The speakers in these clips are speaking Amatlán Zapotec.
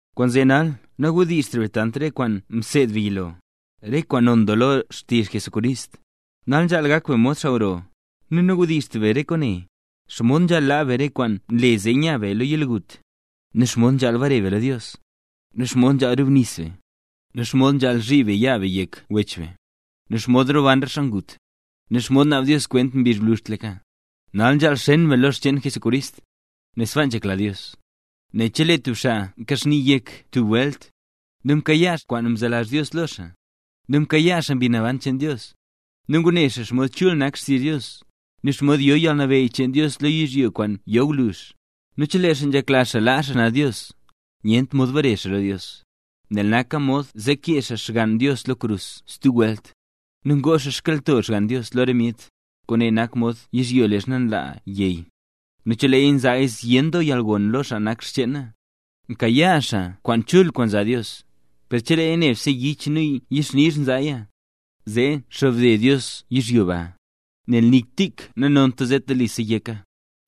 Kwaanzee nal nawdizhtra be tant re kwaan mseedla be yilo, re kwaan non doo lo xtizh Jesucrist. Nal nzhaal gak be mod xaa gro. Nu nawdizhtra be re kwaane: xomod nzhaal laa be re kwaan nle zee nya be lo yalgut, nu xomod nzhaal bare be lo Dios, nu xomod nzhaal rubnis be, nu xomod nzhaal zhiib be yaa be yek wech be, nu xomod roban re xaa ngut, nu xomod naab Dios kwent mbizh gwluzhtlaka. Nal nzhaal xen be lo re xcheen Jesucrist, nel sbaa nzhekla Dios. Nel chelee tub xaa mka xni yek tub welt, nu mkayaa xaa kwaan nzelazh Dios lo xaa, nu mkayaa xaa Mbi Naban cheen Dios, nu ngune xaa xomod chul nak xtizh Dios, nu xomod yo yalnabeyy cheen Dios lo yizhyo kwaan yo gwluzh, nu chelee xaa nzhekla xaa laa xaa xnaz Dios, nyentra mod bare xaa lo Dios, nel naka mod zee kee xaa Xgann Dios lo krus stub welt, nu ngoo xaa xkyalnto Xgann Dios lo re myet. Kwaane nak mod yizhyo leezha nla yey; nu cheleeya nzaaya zyen doo yalgon lo xaa nak cheena, mkayaa xaa kwaan chul kwaan nzaa Dios; per cheleeya nebse yich nu yixnizh nzaaya, zee xobde Dios yizhyo ba, nel nik tik nanonta, zee telisa yeka.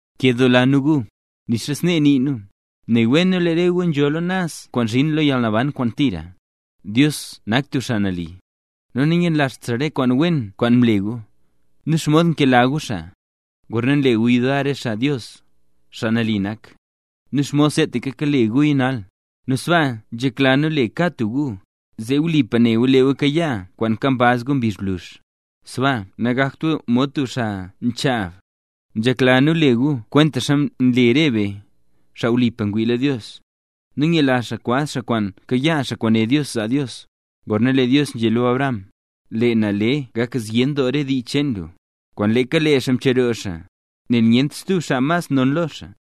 Nkedoola nu gu, nixa snee nii nu, ne wen nu lee re gu nzhola naz kwaan nzhin lo yalnaban kwaan tira. Dios nak tub xaa nali, nu nanyenlazht xaa re kwaan wen kwaan mle gu, nu xomod kakela gu xaa, gorna nle gu yudar re xaa Jesús, xaa nambey nak, nu xomod seetaka kale guya nal. Nu sbaaka nzhekla nu le kad tub gu, zee wlipa ne gu lee gu kayaa kwaan nkambaz gu mbizh gwluzh. Sbaa nagakt gu mod tub xaa nchaab; nzhekla nu le gu kwentaxa nle re nu, xaa wlipa ngwii lo Dios, zee nyela be kwaz be kwaan kayaa be, kwaan né Dios zaa Dios. Gorna lee Dios nzhé lo Abraham: “Lee na le gak zyen doo re dii cheen lu”, kwaan leeka le xaa mcheroo xaa, nel nyentra stub xaa mas non lo xaa,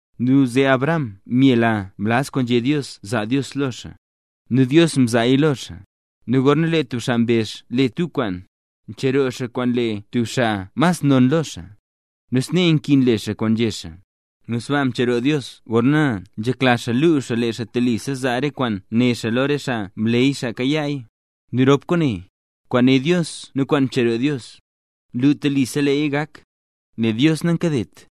Nu zee Abraham myela mlaz kwaan nzhé Dios zaa Dios lo xaa, nu Dios mzaaya lo xaa. Nu gorna lee tub xaa mbezh le tub kwaan, ncheroo xaa kwaan le tub xaa mas non lo xaa; nu snee nkin le xaa kwaan nzhé xaa. Nu sbaaka mcheroo Dios gorna nzhekla xaa luu xaa lee xaa telisa zaa re kwaan né xaa lo re xaa mleey xaa kayaaya. Nu rop kwaane: kwaan né Dios nu kwaan mcheroo Dios, nlu telisa leeya gak, nel Dios nankadet.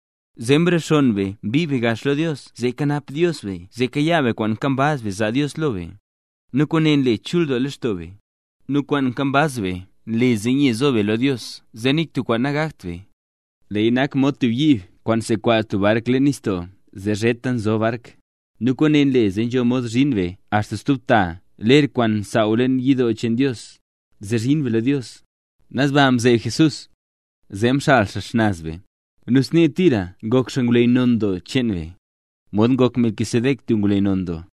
Zee mrexonn be mbii gax be lo Dios zee kanap Dios be zee kayaa be kwaan nkambaz be zaa Dios lo be, nu kwaane nle chul doo lextoo be. Nu kwaan nkambaz be nle zee nye nzo be lo Dios zee nik tub kwaan nagakt be; leeya nak mod tub yiib kwaan nsekwaz tub bark leen nistoo zee zheta nzob bark. Nu kwaane nle zee nzho mod zhin be axta stub ta ler kwaan nsaaw leen yidoo cheen Dios, zee zhin be lo Dios. Naz baa mzeeb Jesús, zee mxal xaa xnaz be, nu snee tira ngok xaa ngwleyy non doo cheen be, mod ngok Melquisedec tub ngwleyy non doo.